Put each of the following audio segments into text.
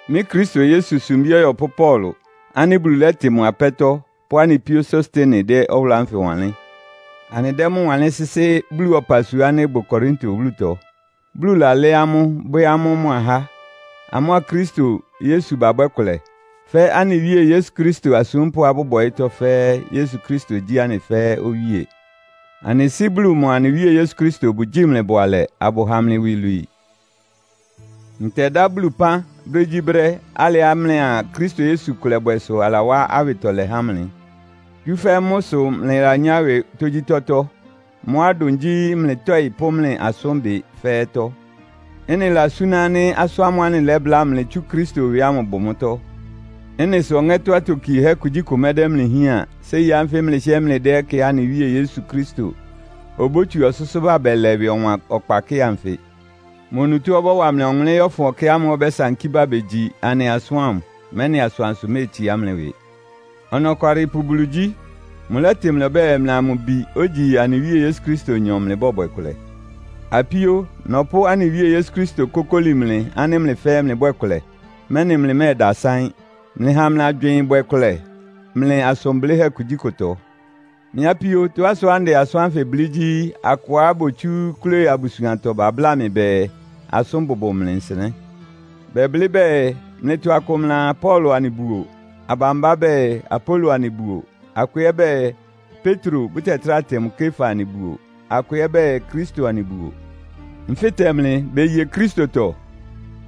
Mɩ́ Kristo Yesu sumbí ɔyɔpʋ́ Paulo ánɩ́ Bulu lɛ́tɩ mʋ apɛ́tɔ́ pʋ́ anɩ píó Sostene dɛ́ ɔwʋlʋ́ ánfɩ wanlɩ́n. Anɩdɛ́ mʋ́ wanlɩ́n sɩ́sɩ́ Bulu ɔpasua ánɩ́ ɩbʋ Korinto wúlutɔ, Bulu lalɛ́ amʋ́, bwɛ́ amʋ́ mʋ ahá. Amʋ́a Kristo Yesu babwɛ́ kʋlɛ, fɛ́ anɩ Wíe Yesu Kristo asúmpʋ́á bʋbʋ ɔyɩ́tɔ́ fɛ́ɛ́, Yesu Kristo gyí anɩ fɛ́ɛ́ Owíe. Anɩ Sɩ́ Bulu mʋa anɩ Wíe Yesu Kristo bʋgyíi mlɩ bʋalɛ, abʋha mlɩ iwilwii. Ntɛdá Bulu pán brégyíbrɛ́, alɩá mlɩa Kristo Yesu kʋlɛbwɛ sʋ alawá awɩtɔlɛ há mlɩ. Tsúfɛ́ mʋ́ sʋ mlɩlanyá ɩwɩ tógyítɔ́tɔ́. Mʋ́á ɩdʋn gyí mlɩ tɔɩ́ pʋ́ mlɩ asʋ́nbɩ fɛ́ɛ́tɔ́. Ɩ́nɩ lasúná ánɩ́ asʋ́n ámʋ́ʋ́ anɩlɛ́bláa mlɩ tsú Kristo ɩwɩ ámʋ bʋ mʋ́tɔ́. Ɩ́nɩ sʋ ɔŋɛ́tɔ́ atokiehɛ́ kugyíkʋ mɛdɛ́ mlɩ hián séi ánfɩ mlɩhɩ́ɛ́ mlɩdɛ́ ɛkɛá anɩ Wíe Yesu Kristo obótsu ɔsʋ́sʋ́ ba bɛlɛ ɩwɩ ɔwan ɔkpa kɩ́ɩ anfɩ. Mʋ onutó ɔbɔ́wa mlɩ ɔwʋnlɩ́n yɔ́fʋn ɛkɛ ámʋ́ʋ́ ɔbɛ́sankí bá begyi anɩ asʋ́n ámʋ, mɛ́nɩ asʋansʋ méetsiá mlɩ ɩwɩ. Ɔnɔkwalɩpʋ Bulu gyí. Mʋlɛ́tɩ mlɩ ɔbɛ́ɛ, mlɩa mʋ Bi, ogyi anɩ Wíe Yesu Kristonyɔ mlɩbɔ́bwɛ kʋlɛ. Apíó, nɔpʋ́ anɩ Wíe Yesu Kristo kókóli mlɩ ánɩ́ mlɩ fɛ́ɛ́ mlɩbwɛ́ɛ kʋlɛ, mɛ́nɩ mlɩmɛ́ɛdasaɩ́n. Mlɩha mlɩ agywɩɩn ɩbwɛ kʋlɛ mlɩ asʋn blɩ́hɛ́ kugyíkʋtɔ. Mɩ́ apíó, tɔ́á sʋá ndɛ asʋ́n ánfɩ blɩ́ gyí, akʋá botsú Kloe abusuantɔ babláa mɩ bɛɛ, asʋ́n bʋbʋ mlɩ nsɩnɛ́. Bɛblɩ́ bɛɛ, mlɩtɔ akʋ mlɩaa, “Paulo anɩbuo.” Abambá bɛɛ, “Apolo anɩbuo.” Akʋ ɛ́ bɛɛ, “Petro, bʋtɛtráa tɩ mʋ Kefa anɩbuo.” Akʋ ɛ́ bɛɛ, “Kristo anɩbuo.” Nfɩ́tɛ mlɩ, beye Kristotɔ?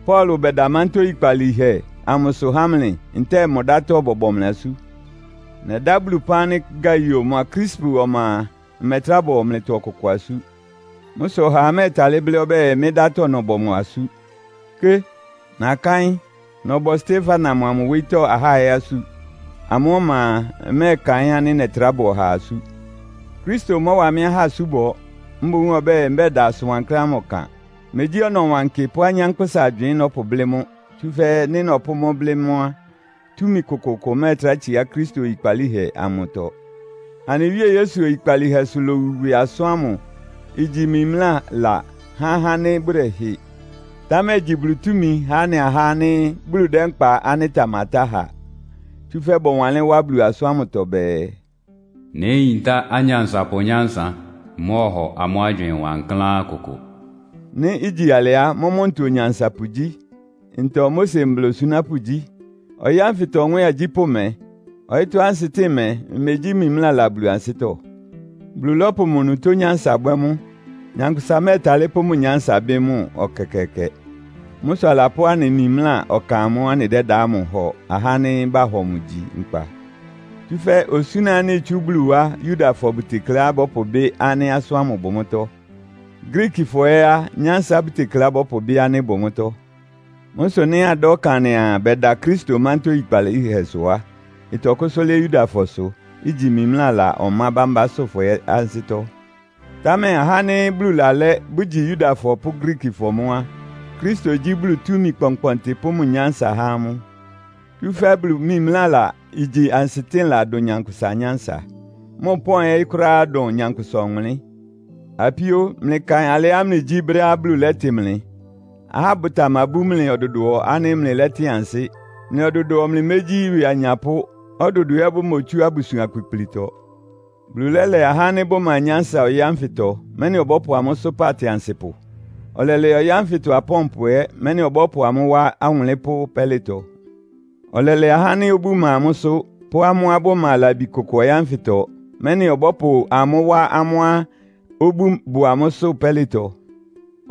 Paulo bɛda mántá oyikpalíhɛ amʋsʋ há mlɩ, ntɛ́ɛ mʋ dátɔ́ bɔbɔ mlɩ asú? Nɛdá Bulu ɩpán ánɩ́ Gaio mʋa Krispu ɔma a, mmɛtrá bɔ mlɩtɔ ɔkʋkʋ asú. Mʋ́ sʋ ɔhaa mɛ́ɛtalɩ́ blɩ́ ɔbɛ́ɛ, mɩ́ ɩdátɔ́ nɔbɔ mʋ asú. Ké! Nakáɩ́n, nɔbɔ Stefana mʋa mʋ wóyítɔ́ ahá ɛ́ asú. Amʋ́ ɔma a, mmɛ́ɛkaɩ́n ánɩ́ nɛtrá bɔ ɔhaa asú. Kristo mɔ́wa mɩ́ ahá asúbɔ. Mboún ɔbɛ́ɛ, mbɛda asʋn wankláán ámʋ ɔkan. Megyí ɔnɔwankɩ pʋ́ anyánkpʋ́sa agywɩɩn nɔ́pʋblɩ́ mʋ́, tsúfɛ́ nɩ́ nɔpʋ́ mʋ́ blɩ́ mʋ́ á, túmi kʋkʋʋkʋ ɩmɛ́ɛtrá tsiá Kristo oyikpalíhɛ amʋtɔ. Anɩ Wíe Yesu oyikpalíhɛsʋ lowu ɩwɩ asʋ́n ámʋ igyi mimlála há ahá ánɩ́ bʋdɛhɩ. Támɛ igyi Bulu túmi há anɩ ahá ánɩ́ Bulu dɛ́ nkpa ánɩ́ ɩtamatá ha. Tsúfɛ́ bɔwanlɩ́n wá Bulu asʋ́n ámʋtɔ bɛɛ, “Néyintá anyansapʋ nyánsa. Mmɔ́ɔhɔ amʋ́ agywɩɩn wankláán kʋkʋ.” Nɩ́ igyi alɩ á, mʋ́mʋ́ ntɔ onyansapʋ gyí? Ntɔ Mose mbla osunápʋ́ gyí? Ɔyɩ́ ánfɩtɔ nwɛ́ɛn agyípʋ́ mɛ? Ɔyɩ́tɔ́ ansɩtɩ́ɩn mɛ́, imegyí mimlála Bulu ansɩ́tɔ́? Bulu lɔ́pʋ mʋ onutó nyánsa bwɛ́ mʋ́. Nyankpʋsa mɛ́ɛtalɩ́ pʋ́ mʋ nyánsa bɩ́ mʋ ɛkɛkɛɛkɛ. Mʋ́ sʋ alapʋ́ anɩ mimlá ɔkan amʋ́ʋ́ anɩdɛ́da ámʋ hɔ ahá ánɩ́ bahɔ mʋ gyi nkpa. Tsúfɛ́ osúna ánɩ́ itsú Bulu wá Yudafɔ bʋtekleá bɔ́pʋbɩ́ ánɩ́ asʋ́n ámʋ bʋ mʋ́tɔ́. Griikifɔ ɛ́ á, nyánsa bʋtekleá bɔ́pʋbɩ́ ánɩ́ ɩbʋ mʋ́tɔ́. Mʋ́ sʋ nɩ́ adá ɔkan anɩaa, bɛda Kristo mántá oyikpalíhɛsʋ á, ɩtɔkʋ́sʋ́ lɩ́ɩ́ Yudafɔsʋ, igyi mimlála ɔmá bámbásʋ́fɔ ɛ́ ansɩ́tɔ́. Támɛ ahá ánɩ́ Bulu lalɛ́, bʋgyi Yudafɔ pʋ́ Griikifɔ mʋ́ á, Kristo gyí Bulu túmi kpɔnkpɔntɩ pʋ́ mʋ nyánsa há amʋ́. Tsúfɛ́ Bulu mimlála igyi ansɩtɩ́nla dʋn nyankpʋsa nyánsa. Mʋ pɔ́n ɛ́ kʋ́ráá dʋn nyankpʋsa ɔwʋnlɩ́n. Apíó, mlɩkaɩn alɩá mlɩgyí brɛ́á Bulu lɛ́tɩ mlɩ. Ahá bʋtamabú mlɩ ɔdʋdʋɔ ánɩ́ mlɩlɛ́tɩn ansɩ́. Mlɩ ɔdʋdʋɔ mlɩmégyí ɩwɩ anyapʋ́, ɔdʋdʋɔ ɛ́ bʋmotsú abusuan kpikplitɔ. Bulu lɛ́lɛ ahá ánɩ́ bʋma nyánsa ɔyɩ́ ánfɩtɔ, mɛ́nɩ ɔbɔ́pʋ amʋ́ sʋ́pa atɩansɩpʋ. Ɔlɛlɛ ɔyɩ́ ánfɩtɔ apɔ́npʋ ɛ́, mɛ́nɩ ɔbɔ́pʋ amʋ́ wá awʋnlɩ́npʋ́ pɛ́lɩtɔ. Ɔlɛlɛ ahá ánɩ́ obú ma amʋ́sʋ́, pʋ́ amʋ́á bʋma labi kʋkʋ ɔyɩ́ ánfɩtɔ, mɛ́nɩ ɔbɔ́pʋ amʋ́ wá amʋ́á obú bʋ amʋ́sʋ́ pɛ́lɩtɔ.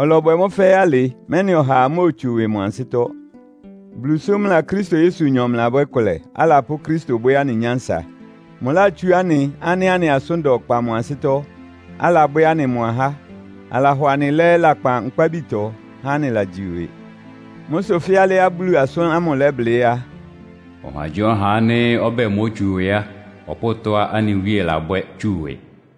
Ɔlɔbwɛ mʋ́ fɛ́ɛ́ alɩ, mɛ́nɩ ɔhaa móotsu ɩwɩ mʋ ansɩ́tɔ́. Bulu sʋ mlɩa Kristo Yesunyɔ mlɩlabwɛ́ kʋlɛ, alapʋ́ Kristo bwɛ́ anɩ nyánsa. Mʋlátsú anɩ ánɩ́ anɩ asʋ́n da ɔkpa mʋ ansɩ́tɔ́, alabwɛ́ anɩ mʋ ahá. Alahɔ anɩ lɛ́ lakpan nkpábitɔ, há anɩlagyi ɩwɩ. Mʋ́ sʋ fɛ́ alɩá Bulu asʋ́n ámʋ lɛ́blɩ́ á, “Ɔhagyíɔha ánɩ́ ɔbɛ́ɛ, mótsu ɩwɩ á, ɔpʋ́ʋ tɔ́á anɩ Wíe labwɛ́ tsu ɩwɩ.”